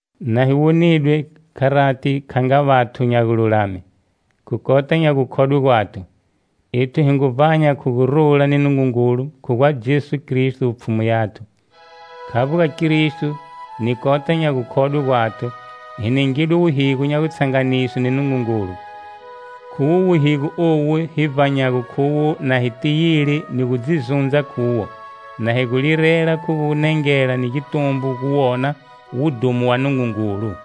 Na hi wonidwe, kharati, kha nga vathu nya gululame, khu kota nya gukhodwe gwathu, ethu hi ngu vbanya khu gurula ni Nungungulu khu gwa Jesu Kristo, Pfhumu yathu. Khavbo ga Kristo ni kota nya gukhodwe gwathu, hi ningidwe wuhigo nya gutshanganiswe ni Nungungulu. Khuwo wuhigo owu hi vbanyago khuwo na hi tiyile ni gu dzi zundza khuwo, na hi gu lirela khu gunengela ni gitumbo guwona wudhumo wa Nungungulu.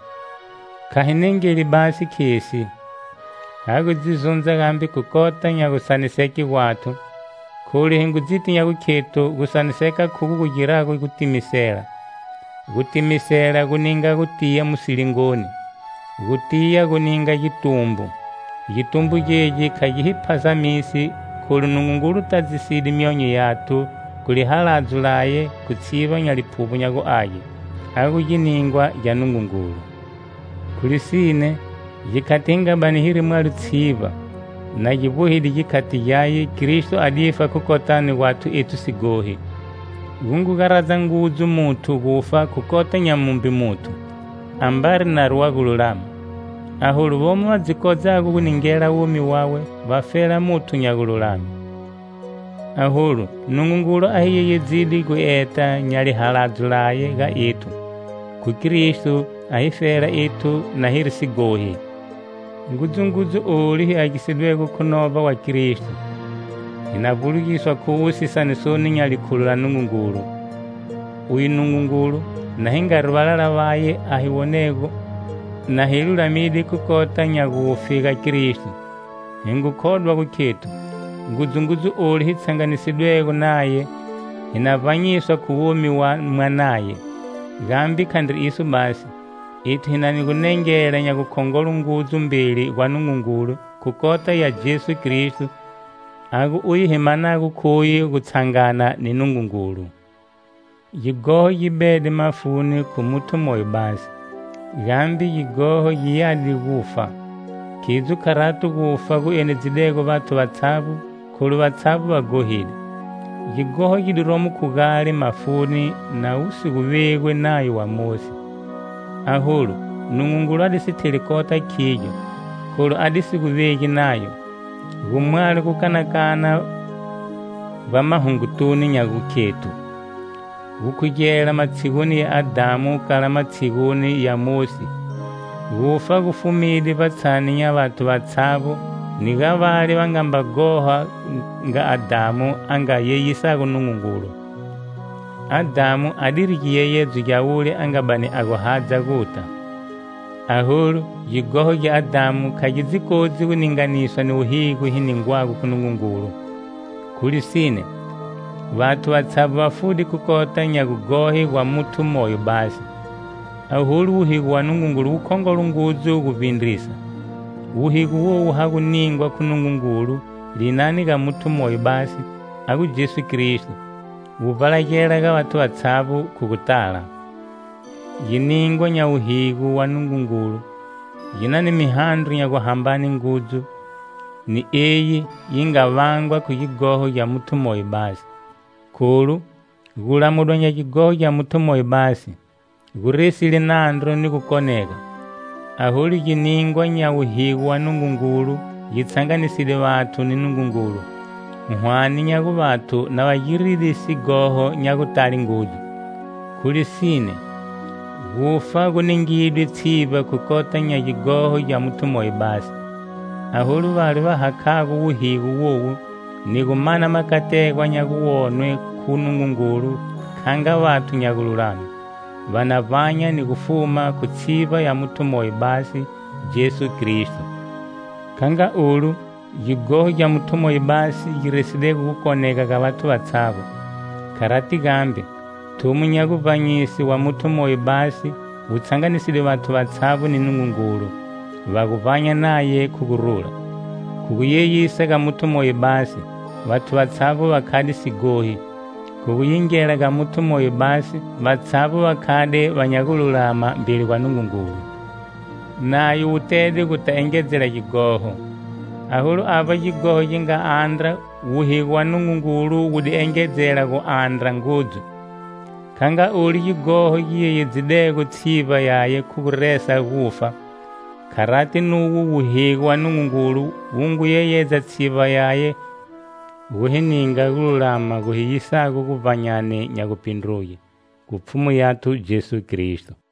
Kha hi nengeli basi khesi, ha gu dzi zundza gambe khu kota nya gusaniseke gwathu, kholu hi ngu dziti nya gukhethu gusaniseka khugo gu girago gutimisela: gutimisela gu ninga gutiya mu silingoni; gutiya gu ninga gitumbo. Gitumbo gegi kha gi hi phazamisi kholu Nungungulu tadzide myonyo yathu khu lihaladzo laye khu tshivba nya Liphuvbo nya gu Age, a gu giningwa gya Nungungulu. Khu lisine, gikhati hi nga bani hiri mwalo tshivba, na gi vbohide gikhati gyaye, Kristo a difa khu kotani gwathu ethu sighohi. Gu ngu garadza ngudzu muthu gufa khu kota nya mumbe muthu, ambari nari wa gululama. Aholu vomo va dzi kodzago gu ningela womi wawe vafela muthu nya gululame. Aholu, Nungungulu a hi yeyedzide gueta nya lihaladzo laye ga ethu, khu gu Kristo a hifela ethu na hiri sighohi. Ngudzungudzu olu hi agisidwego khu novba wa Kristo, hi na vbulugiswa khuwo sisanisoni nya likhulo la Nungungulu. Uye Nungungulu, na hi ngari valala vaye a hi wonego na hi lulamide khu kota nya gufe ga Kristo, hi ngu khodwa gu khethu, ngudzungudzu olu, hi tshanganisidwego naye, hi na vbanyiswa khu womi wa Mwanaye. Gambe khandri iso basi. Ethu hi na ni gunengela nya gukhongolo ngudzu mbeli gwa Nungungulu khu kota ya Jesu Kristo, a gu uye hi manago khuye gutshangana ni Nungungulu. Gighoho gi bede mafuni khu muthu moyo basi, gambe gighoho gi yade gufa. Khidzo kharato gufa gu enedzidego vathu vatshavbo kholu vatshavbo va ghohide. Gighoho gi diromo khu gale mafuni na wu si gu vegwi Nayo wa Mosi. Aholu, Nungungulu a di si theli kota khigyo, kholu a di si gu vegi Nayo. Gu mwalo gukanakana vbamahungotunu nya gukhethu gukhugela matshiguni ya Adhamu kala matshiguni ya Mosi gufa gu fumide vbatshani nya vathu vatshavbo ni ga vale va nga mba ghoha nga Adhamu a nga yeyisago Nungungulu. Adhamu adiri giyeyedzo gya wule a nga bani a gu hadza guta. Aholu, gighoho gya Adhamu kha gi dzi kodzi gu ninganiswa ni wuhigo hi ningwago khu Nungungulu. Khu lisine, vathu vatshavbo va fude khu kota nya gughohe gwa muthu moyo basi; aholu wuhigo wa Nungungulu wukhongolo ngudzu guvbindrisa. Wuhigo wowu ha gu ningwa khu Nungungulu linani ga muthu moyo basi, a gu Jesu Kristo, wu vbalagela ga vathu vatshavbo khu gutala. Giningwa nya wuhigo wa Nungungulu gi na ni mihandro nya guhambane ngudzu ni eyi yi nga vangwa khu gighoho gya muthu moyo basi. Kholu, gulamudwa nya gighoho gya muthu moyo basi, gu resile nandru ni gukonega, aholu, giningwa nya wuhigo wa Nungungulu gi tshanganiside vathu ni Nungungulu, hwane nya gu vathu na va giride sighoho nya gutale ngudzu. Khu lisine, gufa gu ningidwe tshivba khu kota nya gighoho gya muthu moyo basi; aholu vale va hakhago wuhigo wowu ni gu mana makategwa nya guwonwe khu Nungungulu kha nga vathu nya gululame, va na vbanya ni gu fuma khu tshivba ya muthu moyo basi, Jesu Kristo. Kha nga olu, gighoho gya muthu moyo basi gi residego gukonega ga vathu vatshavbo, kharati gambe, thumo nya guvbanyise wa muthu moyo basi, wu tshanganiside vathu vatshavbo ni Nungungulu, va gu vbanya naye khu gurula. Khu guyeyisa ga muthu moyo basi, vathu vatshavbo va khade sighohi, khu gu yingela ga muthu moyo basi vatshavbo va khade va nya gululama mbeli gwa Nungungulu. Nayo wu tede guta engedzela gighoho. Aholu avba gighoho gi nga dandra, wuhigo wa Nungungulu wu di engedzela gudandra ngudzu. Kha nga olu gighoho gi yeyedzidego tshivba yaye khu gu resa gufa, kharati nuwo wuhigo wa Nungungulu wu ngu yeyedza tshivba yaye khu gu hi ninga gululama gu hi yisago guvbanyani nya gupindruge, khu Pfhumu yathu Jesu Kristo.